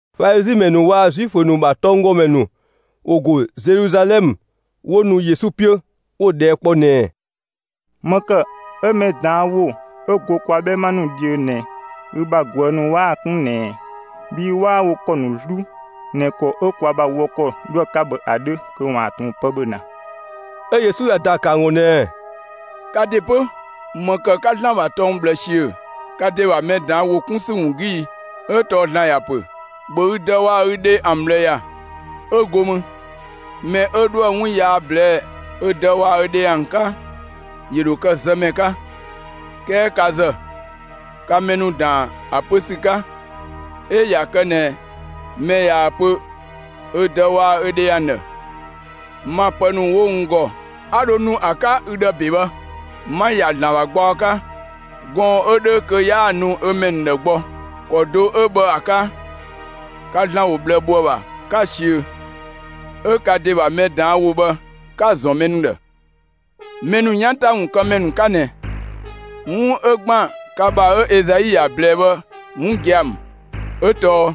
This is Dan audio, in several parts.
Falizi ‑mɛ ‑nu waa‑ Zuifö ‑nu ‑bha tɔnggɔmɛ ‑nu ‑wo ‑go Zeluzalɛmë 'wo nu Yesu 'piö, 'wo‑ ꞊dhɛɛ' kpɔ ꞊nɛɛ: «‑Më ‑kë 'ö mɛ ꞊daan' ‑wo 'ö go kwa 'bhɛma ‑nu dhiö ꞊nɛ, ü bha ꞊guë' ‑nu 'waa‑ 'kun ꞊nɛ ꞊ɛ? Bhii 'waa wo ‑kɔ ‑nu 'zlu ꞊nɛ ‑kɔ 'ö kwa ‑bha wɔ ‑kɔ 'dhoë‑ 'ka bhë ‑a 'dhö kö ‑waan ꞊tun pë ‑bhö ‑na.» 'Ö Yesu ‑ya ‑daa ‑kë ‑an ‑gɔ ꞊nɛɛ: «Ka ‑de 'pö, ‑më ‑kë 'ka ‑Zlan ‑bha tɔng ꞊bhlë ‑siö ka ‑de ‑bha mɛ ꞊daan' ‑wo 'kun ‑sü ‑wun 'gü i? 'Ö tɔɔ ‑Zlan ‑ya ‑pö: ‑Bhö ü dë waa‑ ü dhe ‑an ꞊bhlë ‑ya, 'ö go mü: Mɛ 'ö 'dhoë‑ 'wun yaa ꞊blɛɛ'‑ ö dë waa‑ ö dhe ‑an 'ka, ‑yö ‑dho kë zëmɛ 'ka. 'Kɛɛ ka ‑zë, ka mɛ ‑nu ‑daan ‑a pö ‑sü 'ka: 'Ö ꞊ya kë ꞊nɛ mɛ ꞊yaa‑ pö ö dë waa‑ ö dhe ‑an ‑dhë: ‹Ma pë ‑nu 'wo n ‑gɔ 'a dho nu ‑a 'ka ü ‑dhë ‑be bhë, 'ma‑ ‑ya ‑Zlan ‑bha gbaɔ 'ka›, gɔɔn‑ 'ö 'dhö kö 'yaa‑ nu ö mɛ ‑nu ‑dhë gbɔ. ‑Kɔ do 'ö bhë ‑a 'ka, ka ‑Zlan ‑wo ꞊bhlë ‑bho ‑a ‑bha, 'ka‑ ꞊siö, 'ö ka ‑de ‑bha mɛ ꞊daan' ‑wo bhë 'ka‑ ‑zɔn mɛ ‑nu ‑dhë. Mɛ ‑nu 'yan ‑ta ‑pë kë ‑mɛ ‑nu 'ka ꞊nɛ! 'Wun 'ö ‑gban ka ‑bha 'ö Ezai ‑ya ꞊blɛɛ bhë 'wun gia‑ ‑mü. 'Ö tɔɔ: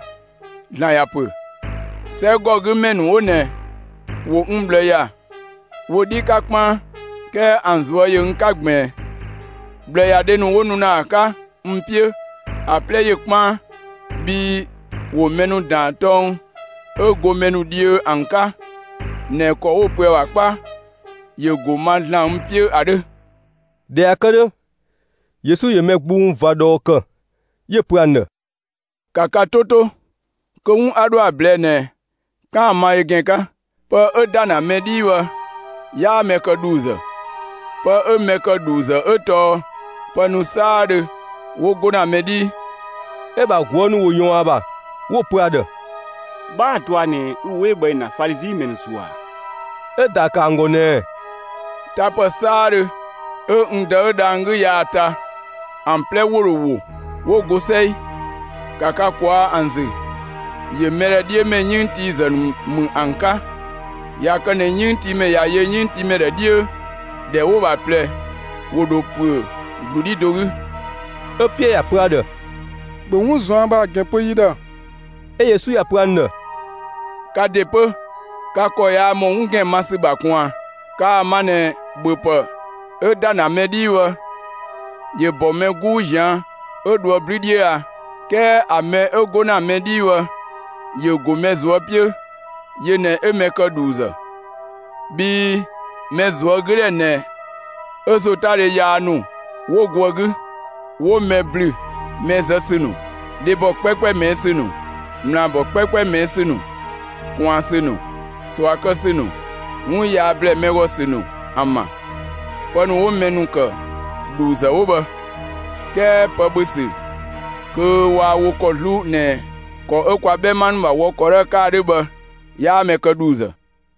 ‑Zlan ‑ya pö: 'Sɛgɔgümɛ ‑nu 'wo ꞊nɛ ‑wo n ꞊bhlë ‑ya wo 'dhi 'ka 'kpaan, 'kɛɛ ‑an ꞊zuö' ‑yö n 'ka ꞊gbiin. ꞊Bhlëyadhe ‑nu 'wo nu ‑na ‑a 'ka n 'piö, ‑a 'plɛ ‑yö 'kpaan, bhii ‑wo mɛ ‑nu ‑daan tɔng 'ö go mɛ ‑nu dhiö ‑an 'ka ꞊nɛ ‑kɔ 'wo‑ pö ‑a ‑bha 'kpa ‑yö ‑go ma ‑Zlan n 'piö ‑a 'dhö.» ꞊Dhɛ ꞊ya kë 'dhö, Yesu ‑yö mɛ gbung ꞊va ꞊dhɔɔ ‑kë, 'yö‑ pö ‑an ‑dhë: «‑Ka ka 'to 'to, kö 'wun 'a 'dhoë‑ ‑a ꞊blɛɛ'‑ ꞊nɛ, 'kaan‑ ‑a ma ö ‑gɛn 'ka! Pë 'ö ‑da ‑na mɛ 'dhii bhë, 'yaa mɛ kë ‑dhuuzë. Pë 'ö mɛ ‑kë ‑dhuuzë 'ö tɔɔ pë ‑nu 'saadhö 'wo 'go ‑na mɛ 'dhii.» 'Ö‑ ‑bha ꞊guë' ‑nu ‑wo ꞊yɔɔn ‑a ‑bha, 'wo‑ pö ‑a ‑dhë: «'Bhaa‑ dɔa ꞊nɛ ü ‑wo 'ö bhë ‑yö ‑na Falizi ‑mɛ ‑nu ‑zuë ‑a?» 'Ö‑ ‑daa ‑kë ‑an ‑gɔ ꞊nɛɛ: «Tapë 'saadhö 'ö n Dë 'ö dhang‑ 'gü yaa‑ ta, ‑an 'plɛ ‑wo ‑dho ‑wo, 'wo go 'sɛi. ‑Ka ka ꞊kwaa' ‑an ‑zü, ‑yö mɛ ‑dhë 'dhiö ‑mɛ 'yënngtiizë ‑nu ‑mü ‑an 'ka! ꞊Ya kë ꞊nɛ 'yënngtiimɛ ꞊ya yö 'yënngtiimɛ ‑dhë 'dhiö, ‑dhɛ 'wo‑ ‑bha ꞊plɛ, ‑wo ‑dho ‑püö ‑glu 'dhi do 'gü!» 'Ö Piɛɛ ‑ya pö ‑a ‑dhë: «‑Bhö 'wun ꞊zuan' bhë ‑a ‑gɛn pö yi ‑dhë!» 'Ö Yesu ‑ya pö ‑an ‑dhë: «Ka ‑de 'pö, ka ‑kɔ yaa ‑mɔ 'wun ‑gɛn ma ‑sü ‑bha ꞊kun ꞊a? Kaa‑ ma ꞊nɛ ‑bhöpë 'ö ‑da ‑na mɛ 'dhii bhë, ‑yö ‑bɔ mɛ 'guu ꞊zian' 'ö dhoë 'blü 'dhiö a? 'Kɛɛ ‑a mɛ 'ö 'go ‑na mɛ 'dhii bhë, ‑yö ‑go mɛ ꞊zuö' 'piö, yö ꞊nɛ 'ö mɛ ‑kë ‑dhuuzë. Bhii mɛ ꞊zuögüdhɛ ꞊nɛ 'ö ‑zotadhe yaa ‑nu 'wo go ‑a 'gü, 'wo mɛ ‑blü mɛ zë ‑sü ‑nu, dhebɔ 'kpɛɛkpɛ ꞊mɛɛ' ‑sü ‑nu, ꞊mlaabɔ 'kpɛɛkpɛ ꞊mɛɛ' ‑sü ‑nu, ꞊kwaan ‑sü ‑nu, ꞊sua kë ‑sü ‑nu, 'wun yaa ‑blɛɛ mɛ ‑gɔ ‑sü ‑nu ‑an ‑bha. Pë ‑nu 'wo mɛ ‑nu ‑kë ‑dhuuzë 'wo bhë, 'kɛɛ pë ‑bhö ‑sü kö waa wo ‑kɔ 'zlu ꞊nɛ ‑kɔ 'ö kwa 'bhɛma ‑nu ‑bha wɔ ‑kɔ 'dhö ‑a 'ka ‑a 'dhö bhë, 'yaa mɛ kë ‑dhuuzë.»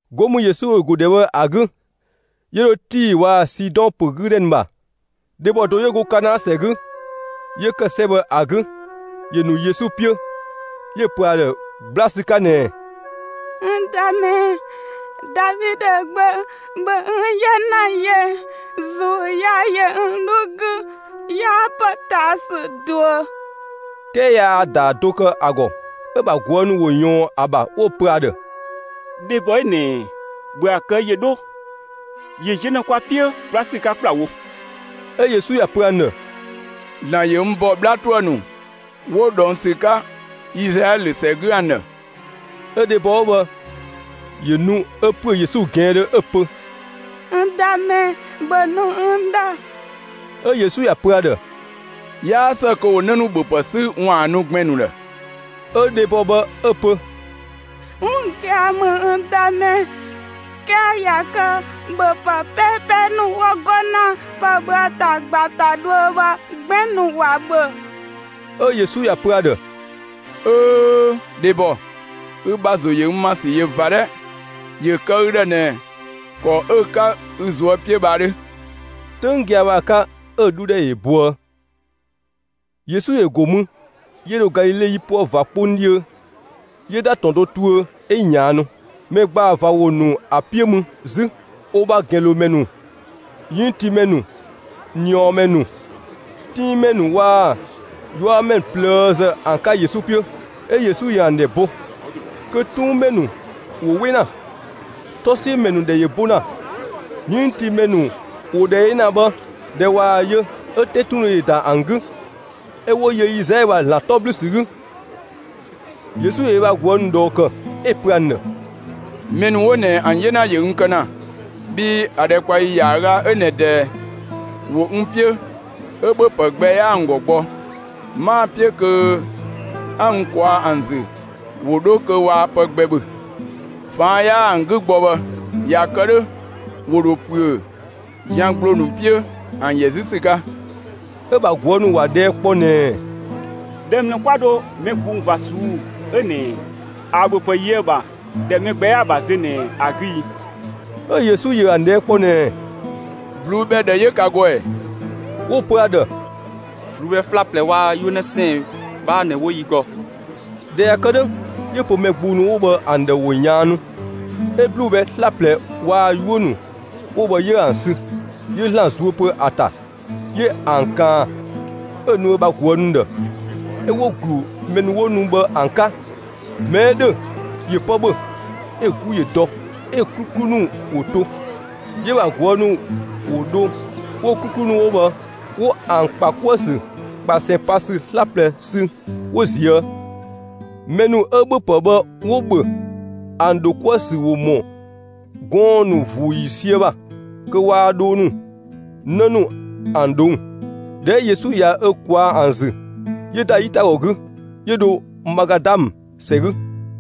'Go mü Yesu ‑yö ‑go ‑dhɛ bhë ‑a 'gü, 'yö dho Tii waa‑ Sidɔn ‑pö 'gü ‑dhɛ ‑nu ‑bha. Dhebɔ do 'yö go Kanaa ‑sɛ 'gü, 'yö ‑kë 'sɛ bhë ‑a 'gü, ‑yö ‑nu Yesu 'piö, 'yö‑ pö ‑a ‑dhë 'gbla ‑sü 'ka ꞊nɛɛ: «N Dëmɛ, Davidö gbö, ‑bhö n 'yena yö! ‑Zuu yaa ‑yö n 'dhu 'gü. 'Yaa ‑potaasü ꞊duö!» 'Kɛɛ yaa‑ ‑daa do kë ‑a ‑gɔ. 'Ö‑ ‑bha ꞊guë' ‑nu ‑wo ꞊yɔɔn ‑a ‑bha 'wo‑ pö ‑a ‑dhë: «Dhebɔ 'ö ꞊nɛ, ‑bhö ‑a kë ‑yö 'dho; ‑yö ziö ‑na kwa 'piö 'gbla ‑sü 'ka ‑kplawo!» 'Ö Yesu ‑ya ‑pö ‑an ‑dhë: «‑Zlan ‑yö n ‑bɔ 'bhla ‑tuë ‑nu 'wo ꞊dhɔng ‑sü 'ka Izlaɛlö ‑sɛ 'gü ‑an ‑dhë.» 'Ö dhebɔ 'ö bhë ‑yö ‑nu 'ö ‑püö Yesu ꞊gɛɛndhö 'ö‑ pö: «N Dëmɛ, ‑bhö nu n ‑dhë!» 'Ö Yesu ‑ya pö ‑a ‑dhë: «'Yaa ‑së kö ‑wo 'në ‑nu ‑bhöpë 'sü ‑waan ‑a nu gbɛn‑ ‑nu ‑dhë.» 'Ö dhebɔ bhë 'ö‑ pö: «'Wun gia‑ ‑mü, n Dëmɛ, 'kɛɛ ꞊ya kë ‑bhöpë 'peepee ‑nu 'wo 'go ‑na pë ‑bhö ‑ta ꞊gba ‑ta dhuö bhë, gbɛn‑ ‑nu ‑wa ‑bhö.» 'Ö Yesu ‑ya pö ‑a ‑dhë: «'Öö, dhebɔ, ü ‑bha ‑zo ‑yö n ‑ma ‑sü ꞊yö ꞊va 'dhɛ! ‑Yö kë ü ‑dhë ꞊nɛ ‑kɔ 'ö‑ 'ka ü ꞊zuö' 'piö bhë ‑a 'dhö!» 'Töng gia‑ bhë ‑a 'ka 'ö‑ 'dhu ‑dhɛ ‑yö boë. Yesu ‑yö ‑go mü, 'yö dho Galile 'yipuë ꞊va 'kpong 'dhiö, 'yö ‑da ‑tɔn do tuö 'ö ꞊yaannu. Mɛ ‑gbaa ꞊va ‑wo ‑nu ‑a 'piö mü 'zü, wo ‑bha ‑gɛnlomɛ ‑nu, 'yënngtiimɛ ‑nu, ꞊niɔɔmɛ ‑nu, 'tuunmɛ ‑nu waa‑ 'yuamɛ ‑nu ꞊plëëzë ‑an 'ka Yesu 'piö, 'ö Yesu ‑yö ‑an ‑dhɛ bo, kö 'tuunmɛ ‑nu ‑wo 'we ‑na, 'tɔsiömɛ ‑nu ‑dhɛ ‑yö bo ‑na, 'yënngtiimɛ ‑nu ‑wo ‑dhɛ yö ‑na bhë. ꞊Dhɛ ꞊waa‑ yö, 'ö 'tetundhe ‑yö ‑da ‑an 'gü, 'ö 'wo yö Izlaɛlö ‑bha ‑Zlan 'tɔ ‑blü ‑sü 'gü. Yesu ‑yö ö bha ꞊guë' ‑nu ꞊dhɔɔ ‑kë, 'ö‑ pö ‑an ‑dhë: «Mɛ ‑nu 'wo ꞊nɛ ‑an 'yena ‑yö n kë ‑na, bhii ‑a ‑dhɛkpaɔyi ‑yaaga 'ö ꞊nɛ ꞊dɛɛ, ‑wo n 'piö, 'ö ‑bhöpë gbɛ 'yaa ‑an ‑gɔ gbɔ; 'maa‑ 'piö kö 'a n ꞊kwaa' ‑an ‑zü ‑wo 'dho kö waa pë gbɛ ‑bhö. ꞊Faan' 'yaa ‑an 'gü gbɔ bhë, ꞊ya kë 'dhö, ‑wo ‑dho ‑püö zian ‑gbloo ‑nu 'piö ‑an ‑yɛ 'zü ‑sü 'ka.» 'Ö‑ ‑bha ꞊guë' ‑nu ‑wa ꞊dhɛɛ' kpɔ ꞊nɛɛ: «‑Dhɛ ‑mlë 'kwa dho mɛ gbung ꞊va ꞊suu'‑ 'ö ꞊nɛ ‑a ‑bhöpë yö ‑a ‑bha; ‑dhɛ 'ö mɛ gbɛ 'yaa‑ ‑bha zö ꞊nɛ ‑a 'gü i?» 'Ö Yesu ‑yö ‑an ꞊dhɛɛ' kpɔ ꞊nɛɛ: «꞊Bluu'‑ bhɛ ꞊dhë 'yö ka ‑gɔ ‑ɛ?» 'Wo‑ pö ‑a ‑dhë: «꞊Bluu'‑ bhɛ 'slaplɛ waa‑ 'yuö‑ 'në 'sɛɛn‑ 'bhaa ꞊nɛ 'wo yi ‑gɔ.» ꞊Dhɛ ꞊ya kë 'dhö, 'yö‑ pö mɛ gbung ‑nu 'wo bhë ‑an ‑dhë ‑wo ꞊yaannu. 'Ö ꞊bluu'‑ bhɛ 'slaplɛ waa‑ 'yuö‑ ‑nu 'wo bhë 'yö ‑an sü, 'yö ‑Zlan zuö pö ‑a ‑ta, 'yö ‑an ꞊kaan, 'ö‑ nu ö bha ꞊guë' ‑nu ‑dhë, 'ö 'wo‑ ‑glu mɛ 'wo nu bhë ‑an 'ka. Mɛ 'ö ‑dhö ‑yö pë ‑bhö, 'ö‑ 'gu ‑yö dɔ, 'ö‑ 'kluklu ‑nu ‑wo to. 'Yö‑ ‑bha ꞊guë' ‑nu ‑wo dho 'wo‑ 'kluklu ‑nu 'wo bhë 'wo ‑an ‑kpa 'kuë‑ ‑sü ꞊kpasɛn pa ‑sü 'slaplɛ sü 'wo ꞊zië'. Mɛ ‑nu 'ö ‑bhöpë bhë 'wo‑ ‑bhö ‑an ‑dho 'kuë‑ ‑sü ‑wo ‑mɔ gɔɔn‑ ‑nu ‑vuu ‑yiisië ‑bha kö waa dhoo ‑nu, 'në ‑nu ‑an ꞊dhong'. ꞊Dhɛ 'ö Yesu ꞊ya ö ‑kwaa ‑an ‑zü, 'yö ‑da 'yitagɔ 'gü, 'yö dho Magadamë ‑sɛ 'gü.